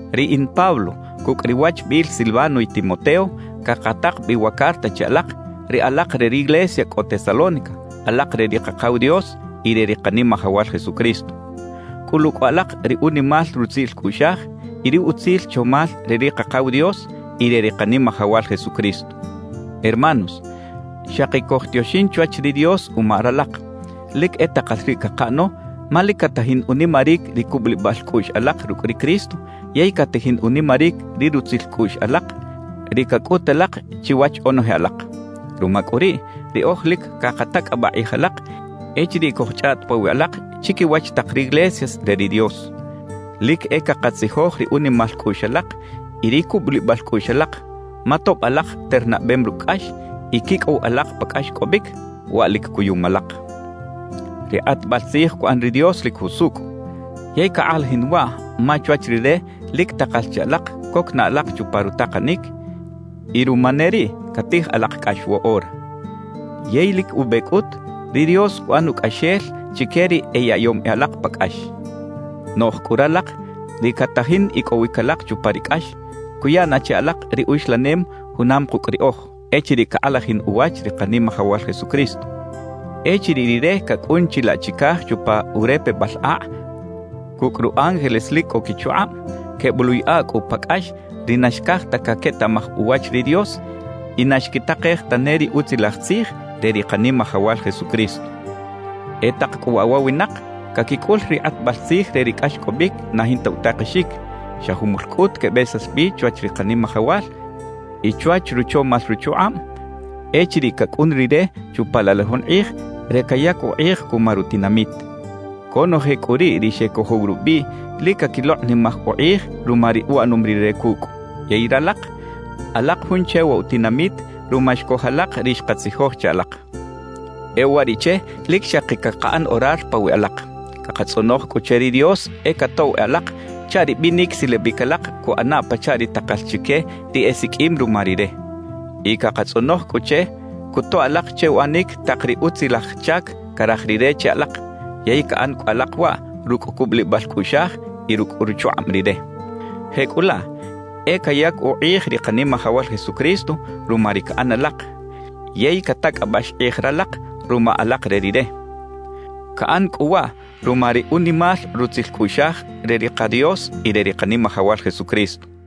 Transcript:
Riꞌin Pablo cucꞌ ri wachbiꞌil Silvano y Timoteo cakatak bi wa carta che alak, ri alak re riglesia cꞌo Tesalónica, alak re ri Kakaw Dios y re ri Kanimajawal Jesucristo. Cꞌulu cꞌu alak ri unimal rutzil cꞌuꞌxaj y ri utzil chomal re ri Kakaw Dios y re ri Kanimajawal Jesucristo. Hermanos, xaki cojtioxin chwach ri Dios uma ralak; lic e takal riꞌ cakaꞌano ma lic catajin unimaric ri cubulibal cꞌuꞌx alak rucꞌ ri Cristo yey catajin unimaric ri rutzil cꞌuꞌx alak, ri cacꞌut alak chiwach onoje alak. Ruma cꞌu riꞌ, riꞌoj lic cakatacꞌabaꞌ kꞌij alak echiriꞌ cojchꞌaꞌt pawiꞌ alak chiquiwach tak riglesias re ri Dios. Lic e cakatzijoj ri unimal cꞌuꞌx alak y ri cubulibal cꞌuꞌx alak; ma tob alak ternabem rucꞌ cꞌax y quicꞌow alak pa cꞌaxcꞌobic, waꞌ lic cuyum alak. Ri kꞌatbal tzij cuꞌan ri Dios lic jusucꞌ, yey cakꞌalajin waꞌ ma chwach Rire lic takal che alak coc na alak chupa rutakanic, y ruma ne riꞌ catij alak cꞌax woꞌora. Yey lic ube cꞌut, ri Dios cuꞌan ucꞌaxel chique ri eyaꞌyom e alak pa cꞌax. Noꞌj cꞌu ralak ri catajin icꞌowic alak chupa ri cꞌax, cuya na che alak ri uxlanem junam kucꞌ riꞌoj echiriꞌ cakꞌalajin uwach ri Kanimajawal Jesucristo. Echiriꞌ Rire cacꞌun chilaꞌ chicaj chupa urepebal akꞌ cucꞌ ru ángeles lic cꞌo quichukꞌab, queboꞌluꞌyaꞌa cꞌu pa cꞌax ri na xcaj ta caquetaꞌmaj uwach ri Dios y na xquitakej tane ri Utzilaj Tzij re ri Kanimajawal Jesucristo. E tak cꞌu waꞌ wa winak caquicꞌul ri kꞌatbal tzij re ri cꞌaxcꞌobic na jinta utakexic; xa jumul cꞌut quebesax bi chwach ri Kanimajawal y chwach ruchomal ruchukꞌab echiriꞌ cacꞌun Rire chupa laꞌ la jun kꞌij re cayac ukꞌij cuma rutinamit. Conoje cꞌu riꞌ ri xecojow rubiꞌ lic caquilokꞌnimaj ukꞌij ruma ri uꞌanom Rire cucꞌ. Yey ralak, alak jun che wa utinamit ruma xcoj alak ri xkatzijoj che alak. E uwariꞌche lic xaki cakaꞌan orar pawiꞌ alak. Cakatzꞌonoj cꞌu che ri Dios e catoꞌw e alak chaꞌ ri binic silabic alak cuꞌana pachaꞌ ri takal chique ri esiqꞌuim ruma Rire. Y cakatzꞌonoj cꞌu che cutoꞌ alak che uꞌanic tak ri utzilaj chac caraj Rire che alak, yey caꞌan cꞌu alak waꞌ rucꞌ cubulibal cꞌuꞌxaj y rucꞌ ruchukꞌab Rire. Jecꞌulaꞌ e cayac ukꞌij ri Kanimajawal Jesucristo ruma ri caꞌan alak, yey catacꞌabax kꞌij ralak ruma alak re Rire. Caꞌan cꞌu waꞌ ruma ri unimal rutzil cꞌuꞌxaj re ri ka Dios y re ri Kanimajawal Jesucristo.